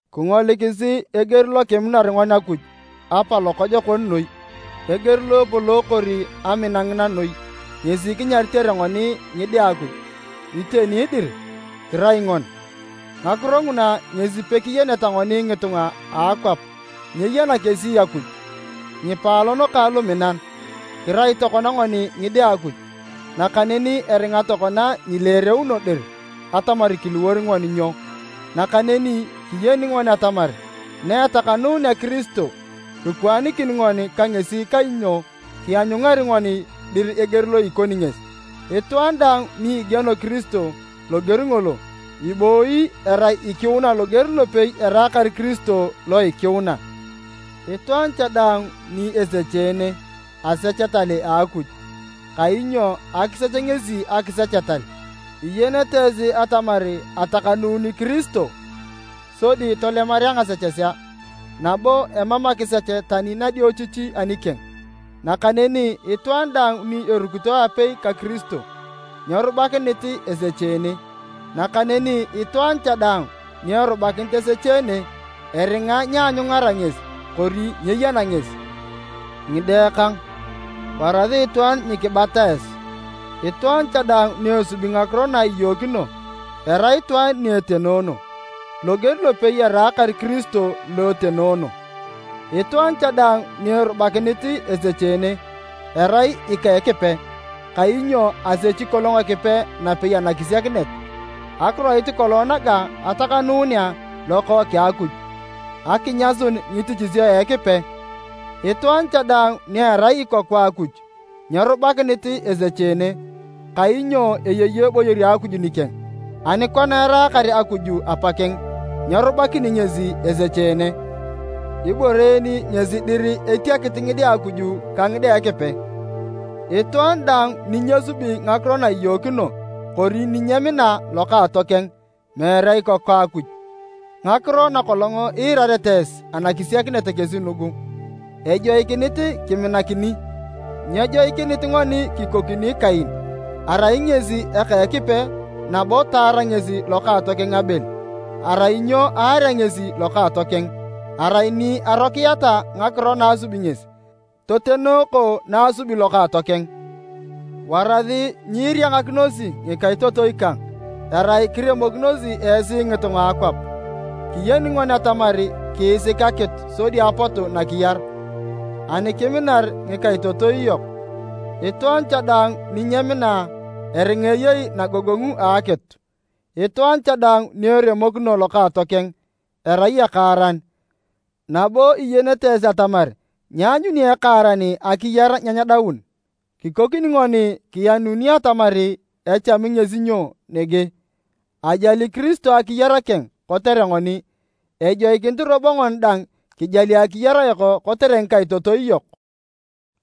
Kingolikisi eger lo kiminar ngoni Akuj Apa lokojokon noi! Eger lo epolookor amina ngina noi ngesi kinyaritere ngoni ngide a Akuj, iteni dir, kirai ngoni. Ngakiro nguna ngesi pekiyeneta ngoni ngitunga a akwap, nyeyena kesi Akuj. Ngipaalon kang luminan, kirai tokona ngoni ngide a Akuj, nakaneni eringa tokona nyileereuno dir atamar kiliwor ngoni nyo. Nakaneni kiyeni ngoni atamar na etakanuunea Kiristo, kikwaanikin ngoni ka ngesi kainyo kianyungari ngoni dir eger lo ikoni ngesi. Itwaan daang ni igieno Kiristo loger ngolo, ibooyi erai lo ikiuna loger lopei eraakar Kiristo lo ikiuna. Itwaan cha daang ni esecheene, asech etal a Akuj, kainyo akisech ngesi akisech etal. Iyenete esi atamar atakanuuni Kiristo sodi tolemarea ngasechesea, nabo emam akisech tani nadiochichi anikeng. Nakaneni itwaan daang ni erukito aapei ka Kiristo, nyerubakinit esecheene, nakaneni itwaan cha daang ni erubakinit esecheene, eringa nyeanyungara ngesi kori nyeyena ngesi. Ngide kang! Warasi itwaan nyikibata esi. Itwaan cha daang ni esubi ngakiro na iyookino, erai itwaan ni etenoono, loger lopei eraakar Kiristo lo etenoono. Itwaan cha daang ni erubakinit esecheene, erai ika Ekipe, kainyo asechi kolong Ekipe napei anakisiakinet. Akiroit kolong naga atakanuunea Lokookeng a Akuj, akinyasun ngitichisio a Ekipe. Itwaan cha daang ni erai ikoku a Akuj nyerubakinit esecheene, kainyo eyei eboyor a Akuj nikeng, ani kona eraakar Akuj Apakeng, nyerubakini ngesi esecheene. Ibore en ngesi dir etiakit ngide a Akuj ka ngide a Ekipe. Itwaan daang ni nyesubi ngakiro na iyookino kori ni nyemina lokaatokeng, meere ikoku a Akuj. Ngakiro na kolong iirarete esi anakisiakinet kesi nugu, ejoikinit kiminakin. Nyejoikinit ngoni kikokini Kain, arai ngesi eka Ekipe nabo taar ngesi lokaatokeng Abel. Arai nyo aarea ngesi lokaatokeng? Arai ni arokiata ngakiro na asubi ngesi, totenooko na asubi lokaatokeng. Warasi nyiiriangakinosi ngikaitotoi kang, erai kiremokinosi esi ngitunga a akwap. Kiyeni ngoni atamar kiisik akitu sodi apotu nakiyar, ani kiminar ngikaitotoi yok. Itwaan cha daang ni nyemina, eringa eyei nagogongu a akitu. Itwaan cha daang ni eremokino lokaatokeng, erai ekaaran, nabo iyenete esi atamar nyeanyuni ekaaran akiyar na nyedaun. Kikokini ngoni kiyenuni atamar echami ngesi nyo nege, ajali Kiristo akiyar keng kotere ngoni. Ejoikinit robo ngoni dang kijali akiyar yok kotere ngikaitotoi yok!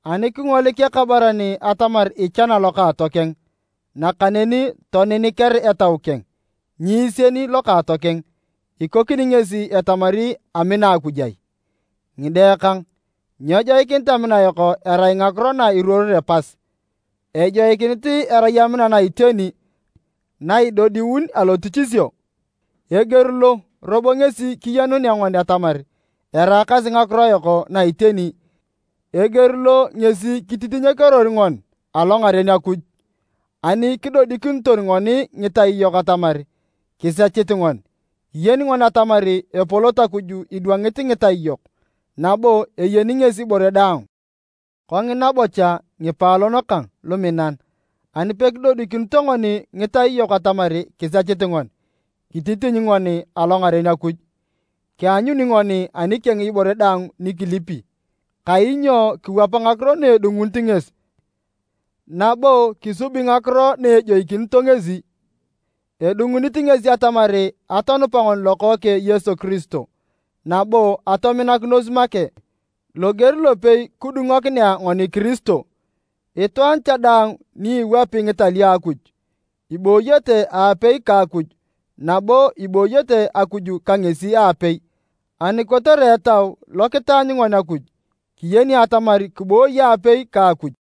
Ani kingolik ekabaran atamar ichana lokaatokeng, nakaneni toniniker etau keng nyiisien lokaatokeng, ikokini ngesi etamari amina Akuj ai? Ngide kang, nyejoikinit amina yok erai ngakiro na iruoroe pas, ejoikinit erai amina na iteni na idodiun alotichisio. Eger lo, robo, ngesi kiyenunea ngoni atamar eraakasi ngakiro yok na iteni, eger lo ngesi kititinyokeror ngoni alongaren Akuj. Ani kidodikinito ngoni ngitai yok atamar kisechit ngoni, kiyeni ngoni atamar epolot Akuj idwangit ngitai yok, nabo eyeni ngesi ibore daang. Kongina bocha ngipaalon kang luminan, ani pekidodikinito ngoni ngitai yok atamar kisechit ngoni, kititiny ngoni alongaren Akuj. Kianyuni ngoni anikeng ibore daang ni kilipi, kainyo kiwap ngakiro na edungunit ngesi nabo kisubi ngakiro na ejoikinito ngesi. Edungunit ngesi atamar atonupa ngoni Lokookeng Yesu Kiristo nabo atominakinos make, loger lopei kidungokinea ngoni Kiristo. Itwaan cha daang ni iwapi ngitalio a Akuj, ibooyete aapei ka Akuj nabo ibooyete Akuj ka ngesi aapei. Ani kotere Etau lo kitaanyu ngoni Akuj, kiyeni atamar kiboi aapei ka Akuj.